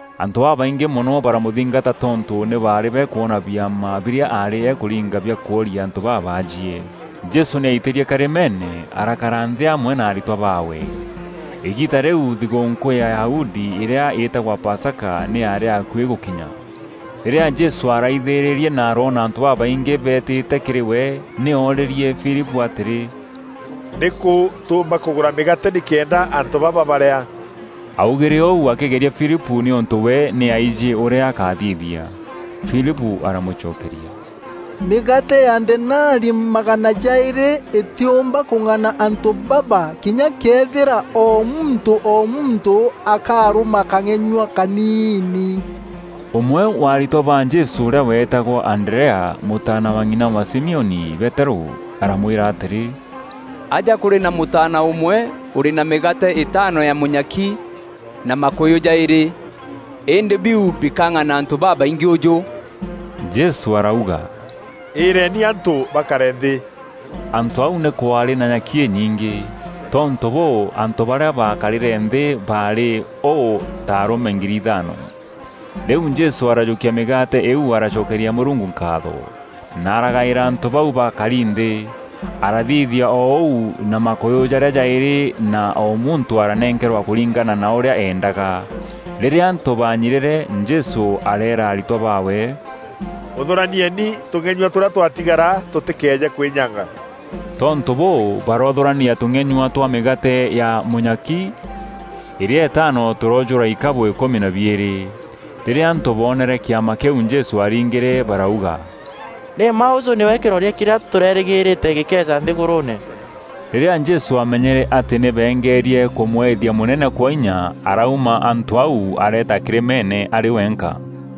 Antû babaingî mono baramûthingata tontû nî baarî bakwona biama birîa aarî akûringa bia kworia antû babaajie. Jesû nî aitîrie karîmeene, arakara nthî amwe na aritwa baawe. Îgiita rîu thigûûnkû ya Ayahudi îrîa îtagwa Pasaka nî yaarî akuî gûkinya. Rîrîa Jesû araithîrîrie na aroona antû babaingî beetîte kîrî we, nî oorîrîe Filipû atîrî, “Nîkû tûûmba kûgûra mîgaate nîkenda antû baba barîa?” Aaugîre ûu akîgeria Filipû nîûntû we nî aijî ûrîa akathithia. Filipû aramûcokeria, “Mîgaate ya denari magana jaîrî îtîûmba kûng'ana antû baba kinya këethîra o muntû o muntû akarûma kang'enyua kaniini.” Ûmwe wa aritwa ba Jesû ûrîa weetagwa Anderea, mûtaana wa ng'ina wa Simioni Peterû, aramwîra atîrî, “Aja kûrî na mûtaana ûmwe ûrî na mîgaate îtaano ya mûnyaki na makûyû jaîrî; îndî biu bikang'ana antû babaingî ûjû?” Jesû arauga, “Îîreeni antû bakare nthî.” Antû aû nî kwaarî na nyaki înyingî. Tontû bûû, antû barîa baakarîre nthî baarî ûû ta arûme ngiri ithaano. Rîu Jesû arajûkia mîgaate îîu aracokeria Mûrungu nkaatho, na aragaîra antû bau baakari nthî. Arathithia o ûu na makûyû jarîa jaîrî na o muntû aranenkerwa kûringana na ûrîa eendaga. Rîrîa antû baanyirîre, Jesû areera aritwa baawe, “Ûthûranieni tûng'enyua tûrîa twatigara tûtîkeeje kwînyanga.” Tontû bûû baroothûrania tûng'enyua twa mîgaate jwa mûnyaki îrîa îtaano tûroojûra ikabû îkûmi na biîrî. Rîrîa antû boonere kîama kîu Jesû aaringîre, barauga, “Nî mma ûûjû nîwe kîroria kîrîa tûrerîgîrîte gîkeeja nthîgûrûûne.” Rîrîa Jesû aamenyere atî nî beengerie kûmwethia mûnene kwa inya, arauma antû au areeta kîrîmeene arî wenka.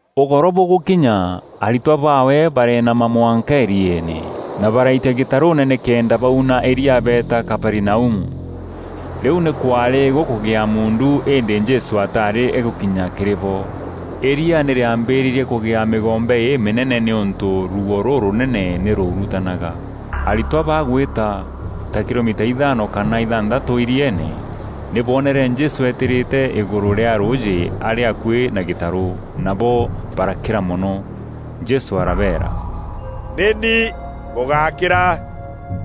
Ûgoro bûgûkinya, aritwa baawe bareenama mwanka îrieene na baraitia gîtarûûne nîkenda bauna îrîa beeta Kaperinaumu. Rîu nî kwaarî gûkûgîa muundu îndî Jesû ataarî agûkinya kîrî bo. Îria nî rîambîrîrie kûgîa mîgombe îmînene nîûntû ruuo rûrûnene nî rwaurutanaga. Aritwa bagwîta ta kilomita ithaano kana ithanthatû îrieene, nî boonere Jesû eetîrîte îgûrû rîa rûûjî arî akuî na gîtarû, nabo barakîra mono. Jesû arabeera, “Nî ni, bûgákîra!”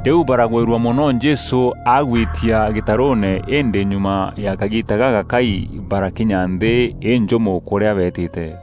Rîu baragwîrua mono Jesû agwitia gîtarûûne îndî nyuma ya kagiita gagakai barakinya nthî înjûmo kûrîa beetîte.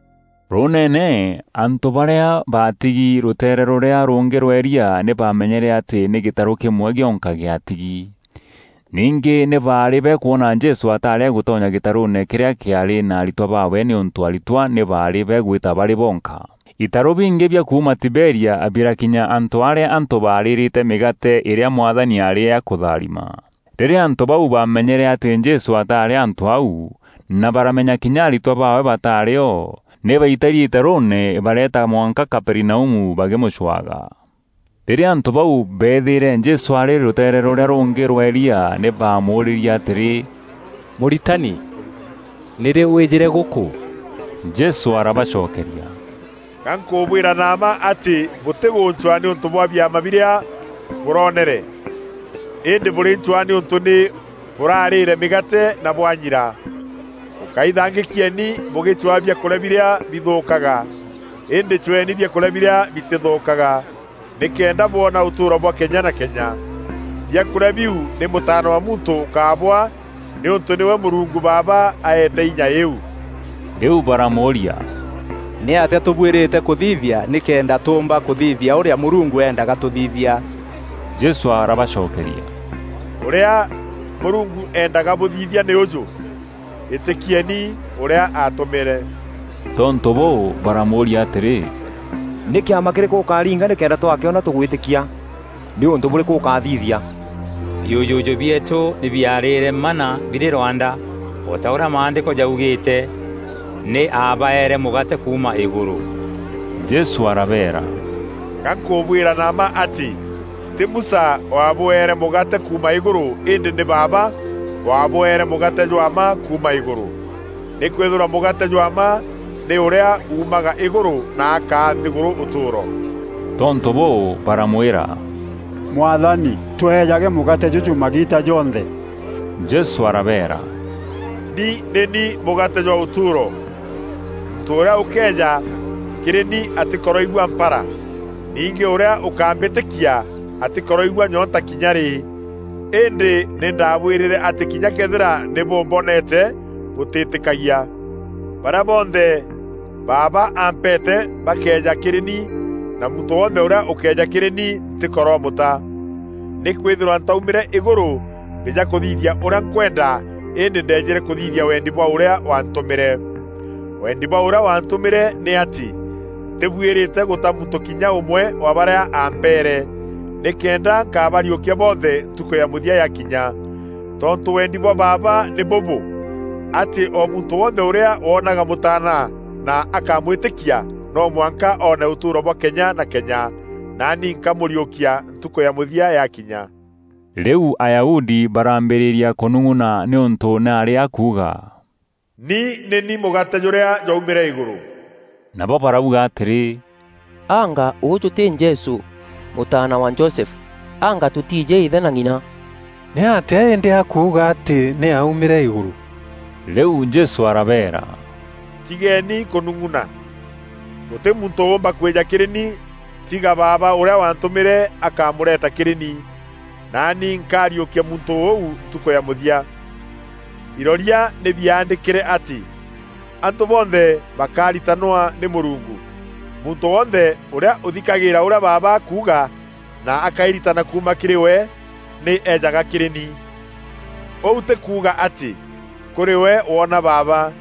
Rûûneene, antû barîa baatigi rûteere rûrîa rûngî rwa îria nî bamenyere atî nî gîtarû kîmwe gîonka gîatigi. Ningî nî baarî bakwona Jesû ataarî agûtonya gîtarûûne kîrîa kîaarî na aritwa baawe nîûntû aritwa nî baarî bagwîta barî boonka. Itarû bingî bia kuuma Tiberia birakinya antû arîa antû baarîîrîte mîgaate îrîa Mwathani aarî akûtharima. Rîrîa antû bau baamenyere atî Jesû ataarî antû au, na baramenya kinya aritwa baawe bataarî o, nî baitîrie itarûûne bareeta mwanka Kaperinaumu bakîmûcwaga. Rîrîa antû bau beethîîre Jesû arî rûteere rûrîa rûngî rwa îria nî baamûûrîrie atîrî, “Mûritani, nîrî wîîjîre gûkû?” Jesû arabacokeria, “Ga nkûbwîra na mma atî bûtîgûncwaa nîûntû bwa biama birîa bûroneere, îndî bûrîncwaa nîûntû nî bûrarîîre mîgaate na bwanyira. Bûkáithangîkieni bûgîcwaa biakûrîa birîa bithûûkaga, îndî cweeni biakûrîa birîa bitîthûûkaga nîkenda bwona ûtûûro bwa kenya na kenya. Biakûrîa biu nî Mûtaana wa Muntû ûkabwaa nîûntû nîwe Mûrungu Baaba aeete inya îîu.” Rîu baramûûria, “Nîatîa tûbuîrîte kûthithia nîkenda tûûmba kûthithia ûrîa Mûrungu eendaga tûthithia?” Jesû arabacokeria “Ûrîa Mûrungu eendaga bûthithia nî ûjû; îtîkieni ûrîa aatûmîre.” Tontû bûû, baramûûria atîrî, “Nî kîama kîrîkû ûkaaringa nîkenda twakîona tûgwîtîkia? Nî ûntû bûrîkû ûkathithia? Biûjûjû bieetû nî biarîre manna birî rwanda, o ta ûrîa Maandîko jaugîîte, ‘Nî aabaeere mûgaate kuuma îgûrû.’” Jesû arabeera, “Ga nkûbwîra na mma atî tî Musa waabûeere mûgaate kuuma îgûrû îndî nî Baaba waabwere mûgaate jwa mma kuuma îgûrû. Nîkwîthîrwa mûgaate jwa mma nî ûrîa uumaga îgûrû na akaa nthîgûrû ûtûûro.” Tontû bûû, baramwîra; “Mwathani, tweejage mûgaate jûjû magiita jonthe.” Jesû arabeera, “Ni nî ni mûgaate jwa ûtûûro. Muntû ûrîa ûkeeja kîrî ni atîkoroigua mpara. Ningî ûrîa ûkambîtîkia atîkoroigua nyoonta kinya rî. Îndî nî ndaabwîrîre atî kinya këethîra nî bûmboneete bûtîîtîkagia. Barîa bonthe Baaba ampeete bakeeja kîrî ni; na muntû wonthe ûrîa ûkeeja kîrî ni ntîkoromûta. Nîkwîthîrwa ntaumîre îgûrû mbîja kûthithia ûrîa nkwenda îndî ndeejîre kûthithia wendi bwa ûrîa waantûmîre. Wendî bwa ûrîa waantûmîre nî atî ntîbuîrîte gûta muntû kinya ûmwe wa barîa ampeere, nîkenda nkabariûkia bonthe ntukû ya mûthia yakinya. Tontû wendi bwa Baaba nî bûbû: atî o muntû wonthe ûrîa woonaga Mûtaana na akamwîtîkia no mwanka oone ûtûûro bwa kenya na kenya. Naani nkamûriûkia ntukû ya mûthia yakinya.” Rîu Ayahudi barambîrîria kûnûng'una nîûntû nî aarî akuuga, “Ni nî ni mûgaate jûrîa jwaumîre îgûrû.” Nabo barauga atîrî, “Anga ûûjû tî Jesû, mûtaana wa Josefu? Anga tûtiijî îthe na ng'ina? Nîatîa îndî akuuga atî nî aaumîre îgûrû?” Rîu Jesû arabeera, “Tigeeni kûnung'una. Gûtî muntû ûûmba kwîja kîrî ni tiga Baaba ûrîa waantûmîre akamûreeta kîrî ni. Naani nkariûkia muntû ûu ntukû ya mûthia. Iroria nî biaandîkîre atî: ‘Antû bonthe bakaritanwa nî Mûrungu.’ Muntû wonthe ûrîa ûthikagîîra ûrîa Baaba akuuga na akairitana kuuma kîrî we, nî ejaga kîrî ni. Ûu tî kuuga atî kûrî we woona Baaba,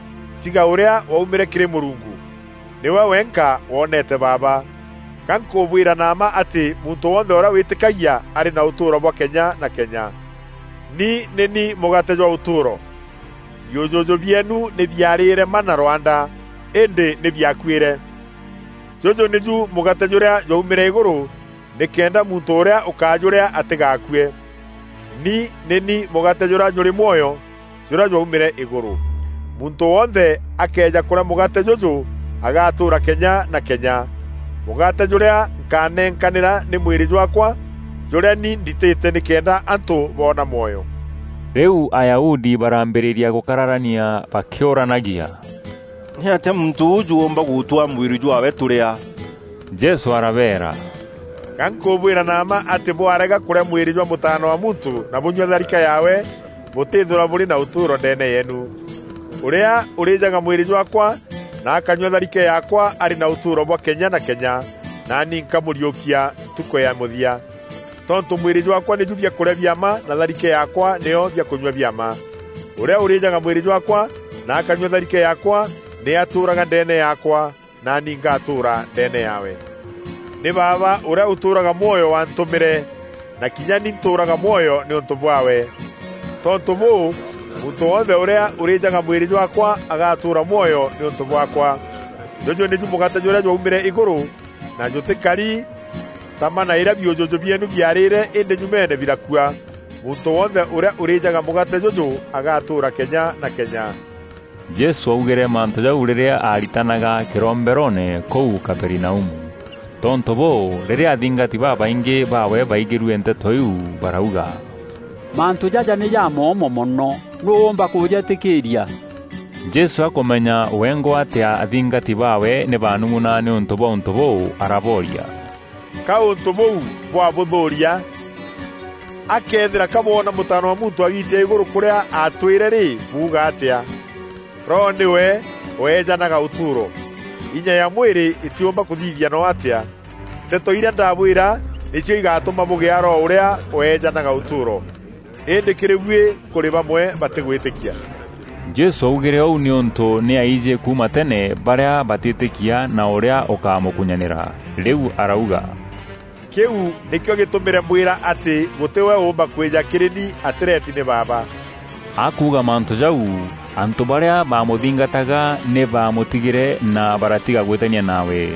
tiga ûrîa waumîre kîrî Mûrungu. Nîwe wenka wonete Baaba. Ga nkûbwîra na mma atî muntû wonthe ûrîa wîtîkagia arî na ûtûûro bwa kenya na kenya. Ni nî ni mûgaate jwa ûtûûro. Biûjûjû bieenu nî biarîîre manna rwanda, îndî nî biakuîre. Jûjû nîju mûgaate jûrîa jwaumîre îgûrû nîkenda muntû ûrîa ûkajûrîa atîgaakue. Ni nî ni mûgaate jûrîa jûrî mwoyo jûrîa jwaumîre îgûrû. Muntû wonthe akëeja kûrîa mûgaate jûjû agaatûûra kenya na kenya. Mûgaate jûrîa nkanekanîra nî mwîrî jwaakwa jûrîa ni nditîte nîkenda antû boona mwoyo.” Rîu Ayahudi baraambîrîria gûkararania bakîûranagia, “Nîatîa muntû ûûjû oomba gûtwaa mwîrî jwaawe tûrîa?” Jesû arabeera, “Ga nkûbwîra na mma atî bwarega kûrîa mwîrî jwa Mûtaana wa Muntû na bûnyua tharike yaawe, bûtîîthîrwa bûrî na ûtûûro ndeene yeenu. Ûrîa ûrîjaga mwîrî jwaakwa na akanyua tharike yaakwa arî na ûtûûro bwa kenya na kenya, naani nkamûriûkia ntukû ya mûthia. Tontû mwîrî jwaakwa nîju biakûrîa bia mma na tharike yaakwa nîyo biakûnyua bia mma. Ûrîa ûrîjaga mwîrî jwaakwa na akanyua tharike yaakwa nî atûûraga ndeene yaakwa, naani ngatûûra ndeene yaawe. Nî Baaba ûrîa ûtûûraga mwoyo waantûmîre, na kinya ni ntûûraga mwoyo nîûntû bwaawe. Tontû bûû muntû wonthe ûrîa ûrîjaga mwîrî jwaakwa agatûûra mwoyo nîûntû bwaakwa. Jûjû nîju mûgaate jûrîa jwaumîre îgûrû na jûtîkari ta manna îrîa biûjûjû bieenu biarîîre îndî nyumeene birakua. Muntû wonthe ûrîa ûrîjaga mûgaate jûjû agatûûra kenya na kenya.” Jesû augîre mantû jau rîrîa aaritanaga kîromberoone kûu Kaperinaumu. Tontû bûû, rîrîa athingati babaingî baawe baigîrue nteto iu barauga, “Mantû jaja nî jamoomo mono! Nûû ûûmba kûjeetîkîîria?” Jesû akûmenya wengwa atî athingati baawe nî bakûnung'una nîûntû bwa ûntû bûu, arabooria, “Ka ûntû bûu bwa bûthûûria? A këthîra kabwona Mûtaana wa Muntû agiitia îgûrû kûrîa aatwîre rî, buuga atîa? Roho nîwe weejanaga ûtûûro; inya ya mwîrî îtîumba kûthithia no atîa. Nteto irîa ndabwîra nîcio igatûma bûgîa Roho ûrîa weejanaga ûtûûro. Îndî kîrî buî kûrî bamwe batîgwîtîkia.” Jesû aaugîre ûu nîûntû nî aaijî kuuma tene barîa batîtîkia na ûrîa ûkamûkunyanîra. Rîu arauga, “Kîu nîkîo gîtûmîre mbwîra atî gûtî we ûûmba kwîja kîrî ni atîreti nî Baaba.” Akuuga mantû jau, antû barîa bamûthingataga nî baamûtigîre na baratiga gwîtania nawe.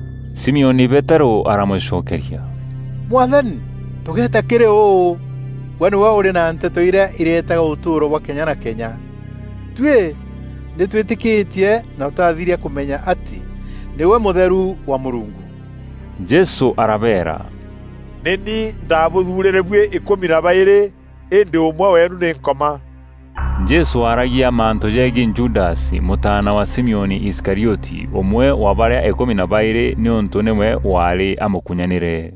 Simioni Peterû aramûcokeria, “Mwathani, tûgeeta kîrî ûu? Gwe nîgwe ûrî na nteto irîa iretaga ûtûûro bwa kenya na kenya. Tuî nî twîtîkîtie na twathiria kûmenya atî nîgwe Mûtheru wa Mûrungu.” Jesû arabeera, “Nî ni ndaabûthuurîre buî îkûmi na baîrî îndî ûmwe weenu nî Nkoma.” Jesû aaragia mantû jeegiî Judasi, mûtaana wa Simioni Iskarioti, ûmwe wa barîa îkûmi na baîrî, nîûntû nîwe waarî amûkunyanîre.